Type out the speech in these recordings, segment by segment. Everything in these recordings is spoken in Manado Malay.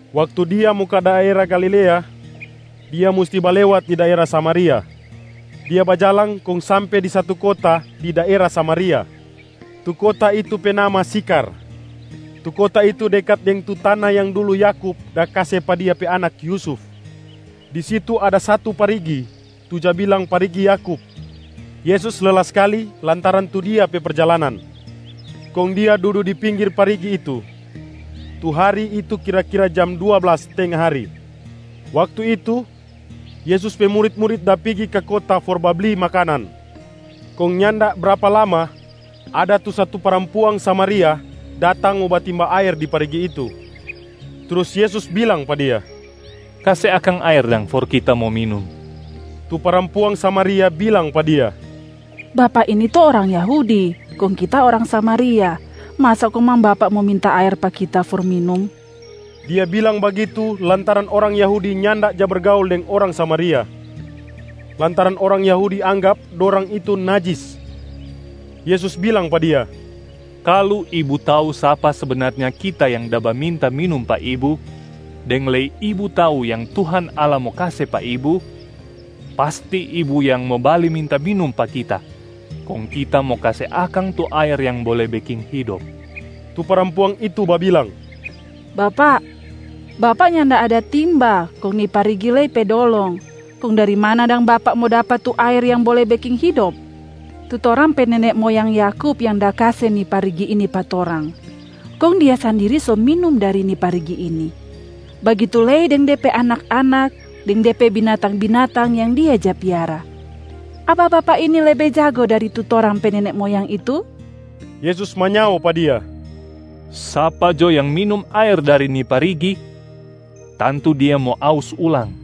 Waktu Dia mo ka daera Galilea, Dia musti balewat di daera Samaria. Dia bajalang kong sampe di satu kota di daera Samaria, tu kota itu pe nama Sikhar. Tu kota itu dekat deng tu tana yang dulu Yakub da kase pa dia pe anak Yusuf. Di situ ada satu parigi, tu ja bilang parigi Yakub. Yesus lela skali lantaran tu Dia pe perjalanan, kong Dia dudu di pinggir parigi itu. Tu hari itu kira-kira jam dua blas tenga hari. Waktu itu, Yesus pe murit-murit da pigi ka kota for babli makanan. Kong nyanda brapa lama, ada tu satu parampuang Samaria datang mo batimba aer di parigi itu. Trus Yesus bilang pa dia, “Kase akang aer dang for Kita mo minum.” Tu parampuang Samaria bilang pa Dia, “Bapak ini to orang Yahudi, kong kita orang Samaria. Masa komang Bapak mo minta aer pa kita for minum!” (Dia bilang bagitu lantaran orang Yahudi nyanda ja bergaul deng orang Samaria, lantaran orang Yahudi anggap dorang itu najis). Yesus bilang pa dia, “Kalu ibu tau sapa sebenarnya Kita yang da baminta minum pa ibu, deng lei ibu tau yang Tuhan Allah mo kase pa ibu, pasti ibu yang mo bale minta minum pa Kita kong Kita mo kase akang tu aer yang bole beking hidop.” Tu parampuang itu babilang, “Bapak, Bapak nyanda ada timba kong ni parigi lei pe dolong. Kong dari mana dang Bapak mo dapa tu aer yang bole beking hidop? Tu torang pe nene moyang Yakub yang da kase ni parigi ini pa torang. Kong dia sandiri so minum dari ni parigi ini, bagitu lei deng de pe anak-anak deng de pe binatang-binatang yang dia ja piara. Apa Bapak ini lebe jago dari tu torang pe nene moyang itu?” Yesus manyao pa dia, “Sapa jo yang minum aer dari ni parigi, tantu dia mo aus ulang.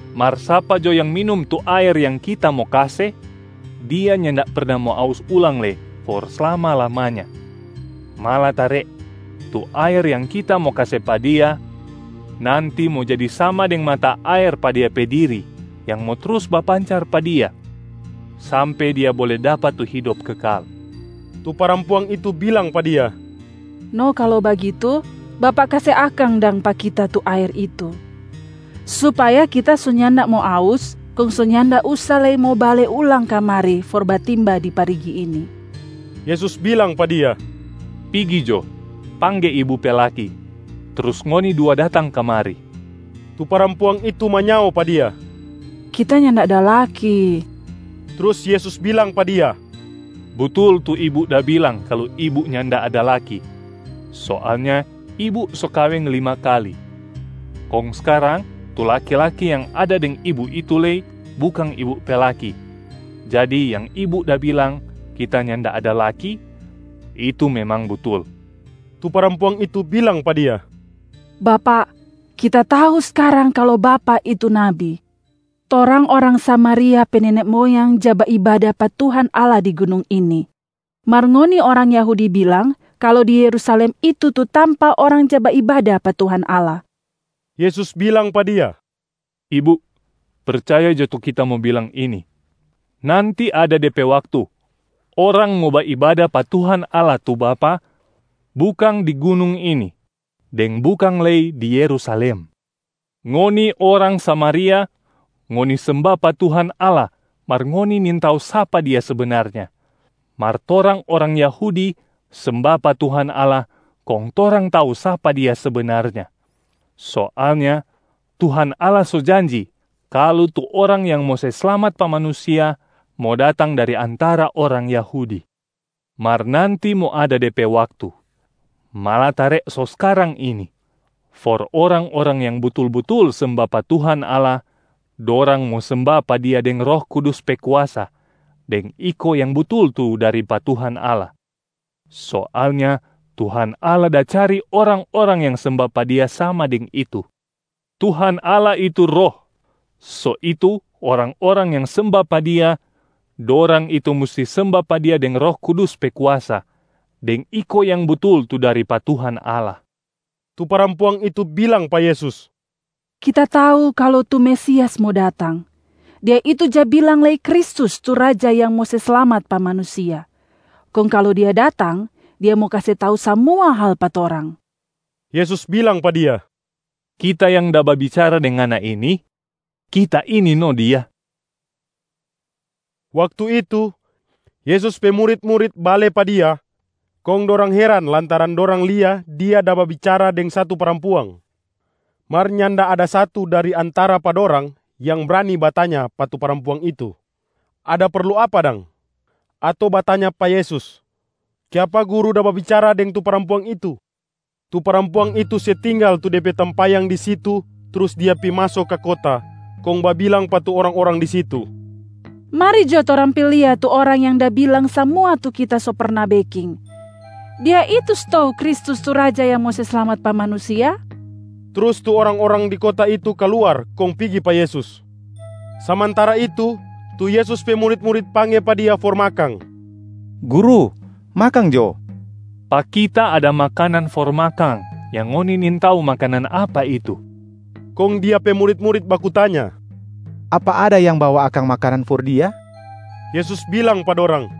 Mar sapa jo yang minum tu aer yang Kita mo kase, dia nyanda perna mo aus ulang lei for slama-lamanya. Malatare tu aer yang Kita mo kase pa dia, nanti mo jadi sama deng mata aer pa dia pe diri yang mo trus bapancar pa dia sampe dia bole dapa tu hidop kekal.” Tu parampuang itu bilang pa Dia, “No kalu bagitu, Bapak kase akang dang pa kita tu aer itu, supaya kita so nyanda mo aus kong so nyanda usa lei mo bale ulang kamari for batimba di parigi ini.” Yesus bilang pa dia, “Pigi jo pangge ibu pe laki, trus ngoni dua datang kamari.” Tu parampuang itu manyao pa Dia, “Kita nyanda ada laki.” Trus Yesus bilang pa dia, “Butul tu ibu da bilang kalu ibu nyanda ada laki. Soalnya ibu so kaweng lima kali, kong skarang tu laki-laki yang ada deng ibu itu lei, bukang ibu pe laki. Jadi yang ibu da bilang, ‘Kita nyanda ada laki’, itu memang butul.” Tu parampuang itu bilang pa Dia, “Bapak, kita tau skarang kalu Bapak itu nabi. Torang orang Samaria pe nene moyang ja baibada pa Tuhan Allah di gunung ini, mar ngoni orang Yahudi bilang kalu di Yerusalem itu tu tampa orang ja baibada pa Tuhan Allah.” Yesus bilang pa dia, “Ibu, percaya jo tu Kita mo bilang ini: nanti ada de pe waktu orang mo baibada pa Tuhan Allah tu Bapa bukang di gunung ini, deng bukang lei di Yerusalem. Ngoni orang Samaria, ngoni semba pa Tuhan Allah mar ngoni nintau sapa Dia sebenarnya, mar torang orang Yahudi semba pa Tuhan Allah kong torang tau sapa Dia sebenarnya. Soalnya Tuhan Allah so janji kalu tu Orang yang mo se slamat pa manusia mo datang dari antara orang Yahudi. Mar nanti mo ada de pe waktu, malatare so skarang ini, for orang-orang yang butul-butul semba pa Tuhan Allah, dorang mo semba pa Dia deng Roh Kudus pe kuasa deng iko yang butul tu dari pa Tuhan Allah. Soalnya Tuhan Allah da cari orang-orang yang semba pa Dia sama deng itu. Tuhan Allah itu Roh, so itu orang-orang yang semba pa Dia, dorang itu musti semba pa Dia deng Roh Kudus pe kuasa deng iko yang butul tu dari pa Tuhan Allah.” Tu parampuang itu bilang pa Yesus, “Kita tau kalu tu Mesias mo datang. Dia itu ja bilang lei Kristus tu Raja yang mo se slamat pa manusia. Kong kalu Dia datang, Dia mo kase tau samua hal pa torang.” Yesus bilang pa dia, “Kita yang da babicara deng ngana ini, Kita ini no Dia.” Waktu itu, Yesus pe murit-murit bale pa Dia kong dorang heran lantaran dorang lia Dia da babicara deng satu parampuang. Mar nyanda ada satu dari antara pa dorang yang brani batanya pa tu parampuang itu, “Ada perlu apa dang?”, ato batanya pa Yesus, “Kiapa Guru da babicara deng tu parampuang itu?” Tu parampuang itu se tinggal tu de pe tampayang di situ trus dia pi maso ka kota kong babilang pa tu orang-orang di situ, “Mari jo torang pi lia tu Orang yang da bilang samua tu kita so perna beking. Dia itu stou Kristus tu Raja yang mo se slamat pa manusia?” Trus tu orang-orang di kota itu kaluar kong pigi pa Yesus. Samantara itu, tu Yesus pe murit-murit pangge pa Dia for makang, “Guru, makang jo.” “Pa Kita ada makanan for makang yang ngoni nintau makanan apa itu.” Kong Dia pe murit-murit baku tanya, “Apa ada yang bawa akang makanan for Dia?” Yesus bilang pa dorang,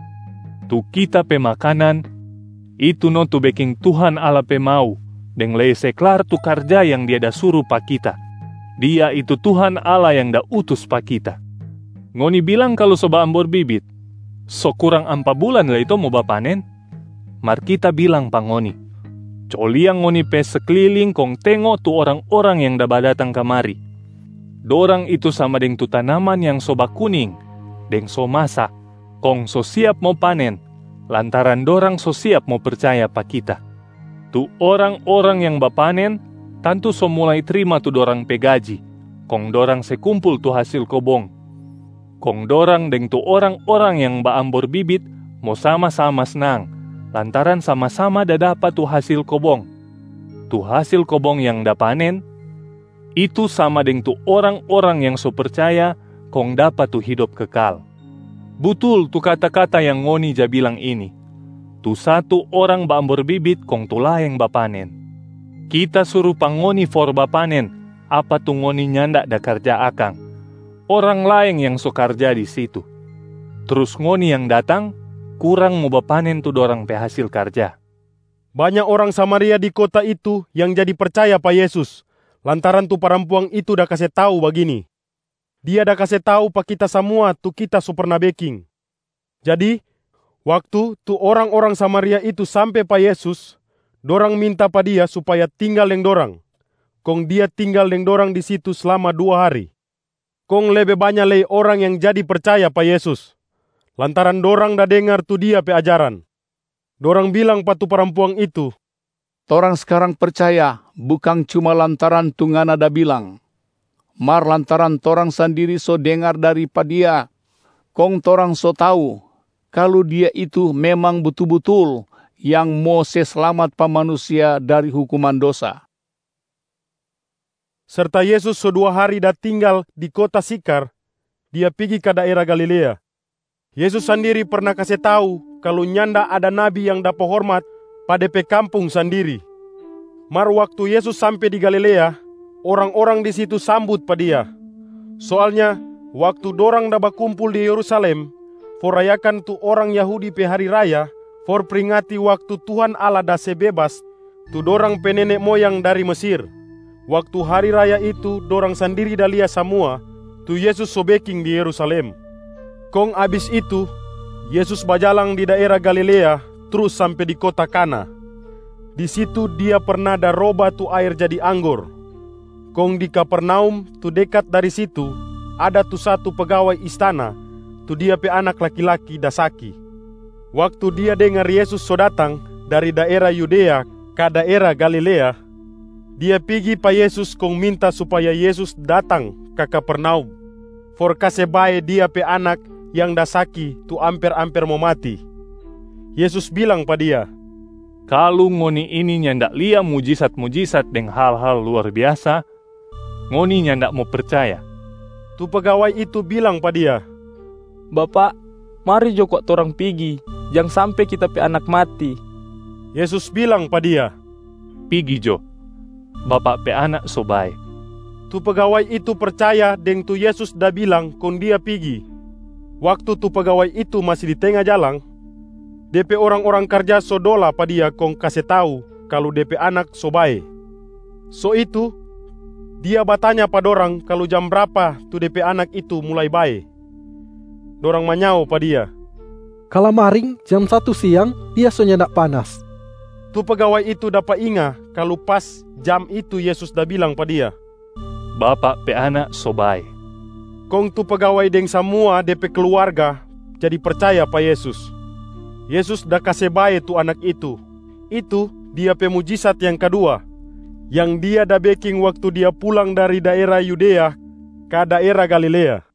“Tu Kita pe makanan, itu no tu beking Tuhan Allah pe mau deng lei se klar tu karja yang Dia da suru pa Kita. Dia itu Tuhan Allah yang da utus pa Kita. Ngoni bilang kalu so baambor bibit, so kurang ampa bulan lei to mo bapanen? Mar Kita bilang pa ngoni: co lia ngoni pe sekliling kong tengo tu orang-orang yang da badatang kamari. Dorang itu sama deng tu tanaman yang so bakuning deng so masa kong so siap mo panen lantaran dorang so siap mo percaya pa Kita. Tu orang-orang yang bapanen tantu so mulai trima tu dorang pe gaji kong dorang se kumpul tu hasil kobong. Kong dorang deng tu orang-orang yang baambor bibit mo sama-sama snang lantaran sama-sama da dapa tu hasil kobong. Tu hasil kobong yang da panen, itu sama deng tu orang-orang yang so percaya kong dapa tu hidop kekal. Butul tu kata-kata yang ngoni ja bilang ini, ‘Tu satu orang baambor bibit kong tu laeng bapanen.’ Kita suru pa ngoni for bapanen apa tu ngoni nyanda da karja akang, orang laeng yang so karja di situ. Trus ngoni yang datang kurang mo bapanen tu dorang pe hasil karja.” Banya orang Samaria di kota itu yang jadi percaya pa Yesus lantaran tu parampuang itu da kase tau bagini, “Dia da kase tau pa kita samua tu kita so perna beking.” Jadi, waktu tu orang-orang Samaria itu sampe pa Yesus, dorang minta pa Dia supaya tinggal deng dorang. Kong Dia tinggal deng dorang di situ slama dua hari. Kong lebe banya lei orang yang jadi percaya pa Yesus lantaran dorang da dengar tu Dia pe ajaran. Dorang bilang pa tu parampuang itu, “Torang skarang percaya bukang cuma lantaran tu ngana da bilang, mar lantaran torang sandiri so dengar dari pa Dia kong torang so tau kalu Dia itu memang butul-butul yang mo se slamat pa manusia dari hukuman dosa.” Serta Yesus so dua hari da tinggal di kota Sikhar, Dia pigi ka daera Galilea. Yesus sandiri perna kase tau kalu nyanda ada nabi yang dapa hormat pa de pe kampung sandiri. Mar waktu Yesus sampe di Galilea, orang-orang di situ sambut pa Dia. Soalnya waktu dorang da bakumpul di Yerusalem for rayakan tu orang Yahudi pe hari raya for pringati waktu Tuhan Allah da se bebas tu dorang pe nene moyang dari Mesir, waktu hari raya itu dorang sandiri da lia samua tu Yesus so beking di Yerusalem. Kong abis itu, Yesus bajalang di daera Galilea trus sampe di kota Kana. Di situ Dia perna da roba tu aer jadi anggor. Kong di Kapernaum tu dekat dari situ, ada tu satu pegawai istana tu dia pe anak laki-laki da saki. Waktu dia dengar Yesus so datang dari daera Yudea ka daera Galilea, dia pigi pa Yesus kong minta supaya Yesus datang ka Kapernaum for kase bae dia pe anak yang da saki tu amper-amper mo mati. Yesus bilang pa dia, “Kalu ngoni ini nyanda lia mujisat-mujisat deng hal-hal luar biasa, ngoni nyanda mo percaya.” Tu pegawai itu bilang pa Dia, “Bapak, mari jo kwa torang pigi, jang sampe kita pe anak mati.” Yesus bilang pa dia, “Pigi jo, bapak pe anak so bae.” Tu pegawai itu percaya deng tu Yesus da bilang kong dia pigi. Waktu tu pegawai itu masi di tenga jalang, dia pe orang-orang karja so dola pa dia kong kase tau kalu de pe anak so bae. So itu, dia batanya pa dorang kalu jam brapa tu de pe anak itu mulai bae. Dorang manyao pa dia, “Kalamaring jam satu siang, dia so nyanda panas.” Tu pegawai itu dapa inga kalu pas jam itu Yesus da bilang pa dia, “Bapak pe anak so bae.” Kong tu pegawai deng samua de pe kluarga jadi percaya pa Yesus. Yesus da kase bae tu anak itu, itu Dia pe mujisat yang kadua yang Dia da beking waktu Dia pulang dari daera Yudea ka daera Galilea.